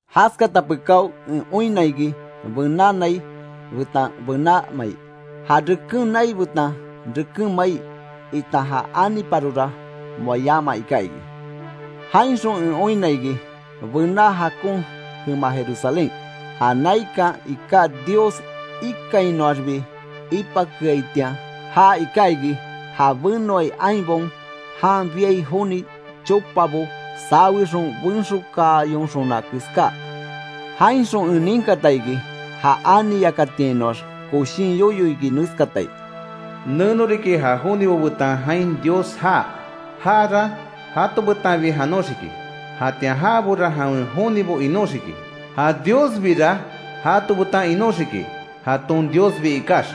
Jaskata pekáo en oinna iki bená nai betan bená mai. Ja reken nai betan reken mai, itan ja aniparora moa yama iká iki. Jainxon en oinna iki, bená jakon jema Jerusalén, ja naikan iká Dios ikainnoaxbi ipakeaitian. Ja iká iki, ja benoai ainbaon jan biai joni chopabo sawexon benxokaayonxona keská. Jainxon en ninkata iki, ja ani yakátiainoax koshin yoyo iki neskatai: “Neno riki ja jonibo betan jain Dios jaa; jara jato betanbi janoxiki. Jatian jabora jawen jonibo inóxiki; ja Diosbira jato betan inóxiki jaton Diosbi ikax.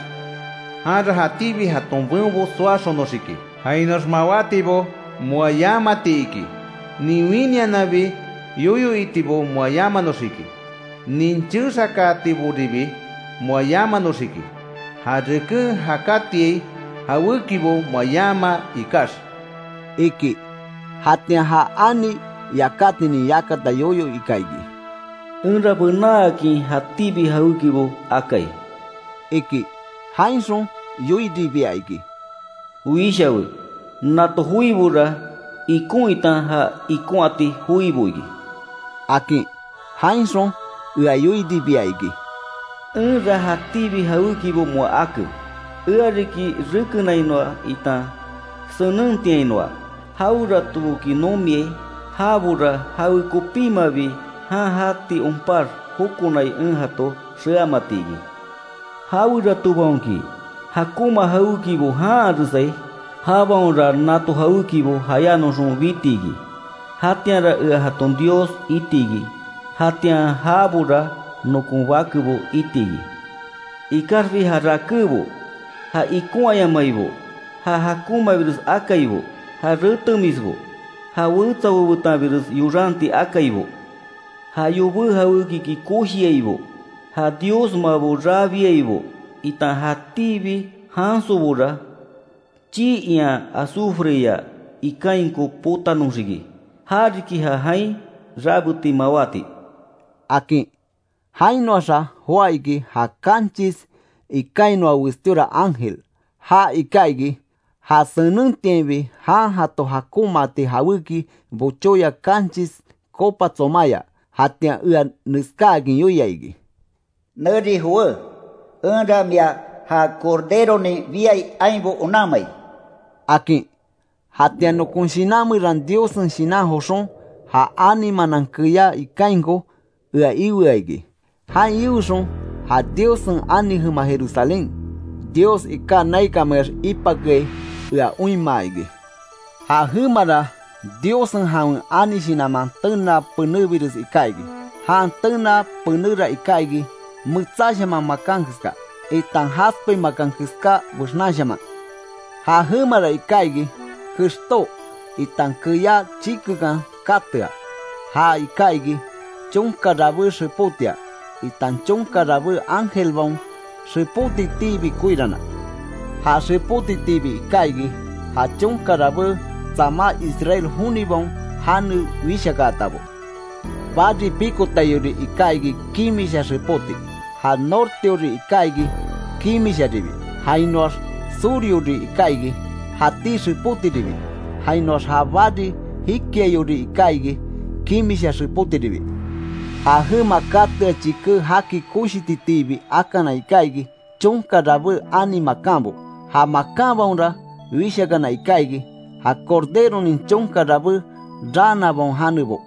Janra jatíbi jaton beonbo soaxononxiki jainoax mawátibo moa yamati iki, nin winiananbi yoyo itibo moa yamanoxiki, nin chexakaatiboribi moa yamanoxiki, ja reken jakátiai jawékibo moa yama ikax”, iki. Jatian ja ani yakátinin yakata yoyo ika iki: “Enra benaakin jatíbi jawékibo akai”, iki. Jainxon yoiribia iki: “Wishawe. Nato joibora ikon itan ja ikonhati joibo iki”, akin. Jainxon ea yoiribia iki: “Enra jatíbi jawékibo moa ake. Ea riki rekenainoa, itan senentiainoa. Jaweratoboki nomiai, jabora jawe kopímabi jan jati onpax jokonai en jato xeamati iki. Jaweratobaonki jakonma jawékibo janharesai, jabaonra nato jawékibo jayánoxon biti iki. Jatianra ea jaton Dios iti iki, jatian jabora nokon bakebo iti iki. Ikaxbi ja rakébo, ja ikonhayamaibo, ja jakonmabires akaibo, ja retemisbo, ja wetsabo betanbires yoranti akaibo, ja yobé jawékiki koshiaibo, ja diosmabo rabiaibo itan jatíbi jansobora, chii ian azufreya ikainko potanoxiki. Ja riki ja jain rabeti mawáti”, akin. Jainoaxa joá iki ja kanchis ikainoa westíora ángel. Já iká iki, ja senentiainbi jan jato jakonmaati jawéki bochóya kanchis copa tsomaya. Jatian ea neskáakin yoia iki: “Neri jowé; enra mia ja corderonin biai ainbo onanmai”, akin. Jatian nokon shinan meran Diossen Shinan joxon ja ani manan keyá ikainko ea ioa iki. Jain ioxon ja Diossen ani jema Jerusalén, Dios iká naikanmeax ipakeai ea oinmaa iki. Ja jemara Diossen jawen ani shinanman tenaa penebires iká iki; jan tenaa penéra iká iki metsáshaman makan keska, itan jaspe makan keska bexnanshaman. Ja jemara iká iki kextó itan keyá chikekan katea. Ja iká iki chonka rabé xepótia, itan chonka rabé ángelbaon xepótitiibi koirana. Ja xepótitiibi iká iki, ja chonka rabé tsamá Israel jonibaon jane wishakaatabo. Bari pikotaiori iká iki kimisha xepóti. Ja norteori iká iki kimisharibi, jainoax suryori iká iki, jatí xepótiribi jainoax ja bari jikiaiori iká iki kimisha xepótiribi. Ja jema katea chiké jaki koshititiibi akana iká iki, chonka rabé ani makanbo. Ja makanbaonra wishakana iká iki; ja Corderonin chonka rabé raanabaon janebo.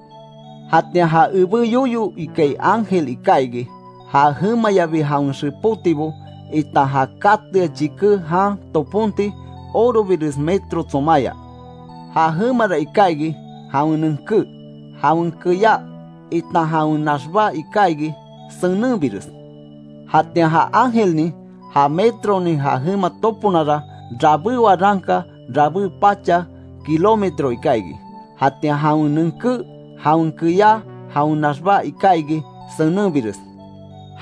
Jatian ja ebé yoyo ikai ángel iká iki, ja jemayabi jawen xepótibo, itan ja katea chiké jan toponti orobires metro tsomaya. Ja jemara iká iki jawen nenké, jawen keyá itan jawen naxbá iká iki senenbires. Jatian ja ángelnin ja metronin ja jema toponara, rabé waranka rabé pacha Kilómetro iká iki. Jatian jawen nenké, jawen keyá, jawen naxbá iká iki senenbires.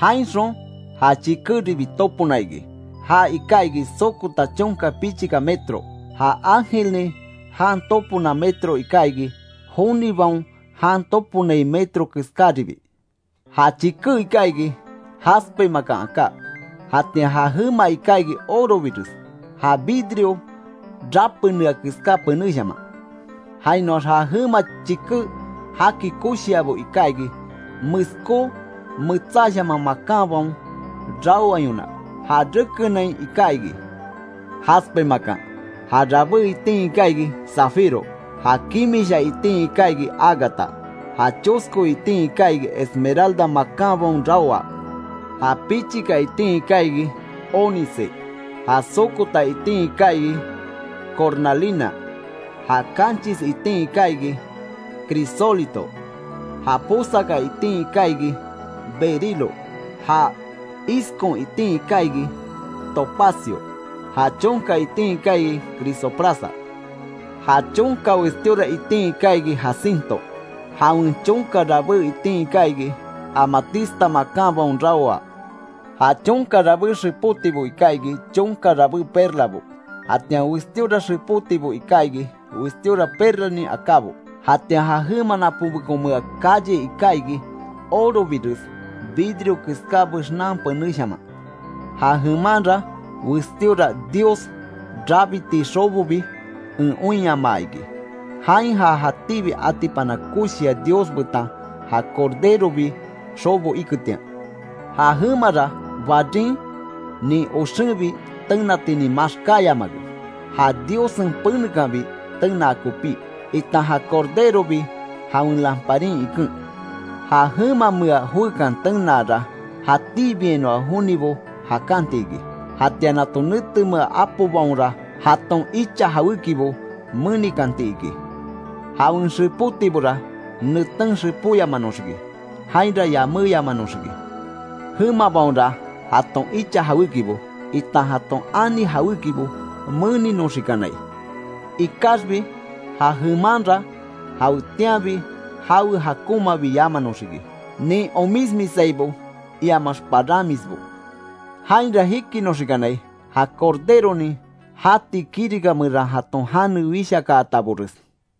Jainxon ja chikéribi topona iki, ja iká iki sokota chonka pichika metro; ja ángelnin jan topona metro iká iki, jonibaon jan toponai metro keskaribi. Ja chiké iká iki jaspe makan aká; jatian ja jema iká iki orobires, ja vidrio rapenea keská penéshaman. Jainoax ja jema chiké jaki koshiabo iká iki, meskó metsáshaman makanbaon raoayona; ja rekenain iká iki; jaspe makan, ja rabé itin iká iki zafiro, ja kimisha itin iká iki ágata, ja chosko itin iká iki esmeralda makanbaon raoa, ja pichika itin iká iki, ónice; ja sokota itin iká iki cornalina, ja kanchis itin iká iki crisólito, ja posaka itin iká iki berilo, ja iskon itin iká iki topacio, ja chonka itin iká iki, crisoprasa; ja chonka westíora itin iká iki jacinto, jawen chonka rabé itin iká iki, amatista makanbaon raoa. Ja chonka rabé xepótibo iká iki, chonka rabé perlabo. Jatian westíora xepótibo iká iki, westíora perlanin akábo. Jatian ja jema napónbekonmea calle iká iki, orobires, vidrio keská bexnan penéshaman. Ja jemanra westíora Dios rabiti xobobi en oinyamaa iki. Jain ja jatíbi atipana koshia Dios betan ja Corderobi xobo iketian. Ja jemara barin nin oxenbi tenatinin maxkáyamake. Ja Diossen penekanbi tenaa kopí, itan ja Corderobi jawen lamparin iken. Ja jemamea joekan tenaara jatíbiainoa jonibo jakanti iki. Jatian nato netemea apobaonra jaton icha jawékibo menikanti iki. Jawen xepótibora neten xepóyamanoxiki, jainra yaméyamanoxiki. Jemabaonra jaton icha jawékibo, itan jaton ani jawékibo meninoxikanai. Ikaxbi ja jemanra jawetianbi jawe jakonmabi yamanoxiki, nin omismisaibo iamax paranmisbo. Jainra jikinoxikanai, ja Corderonin jati kirika meran jaton jane wishakaatabores.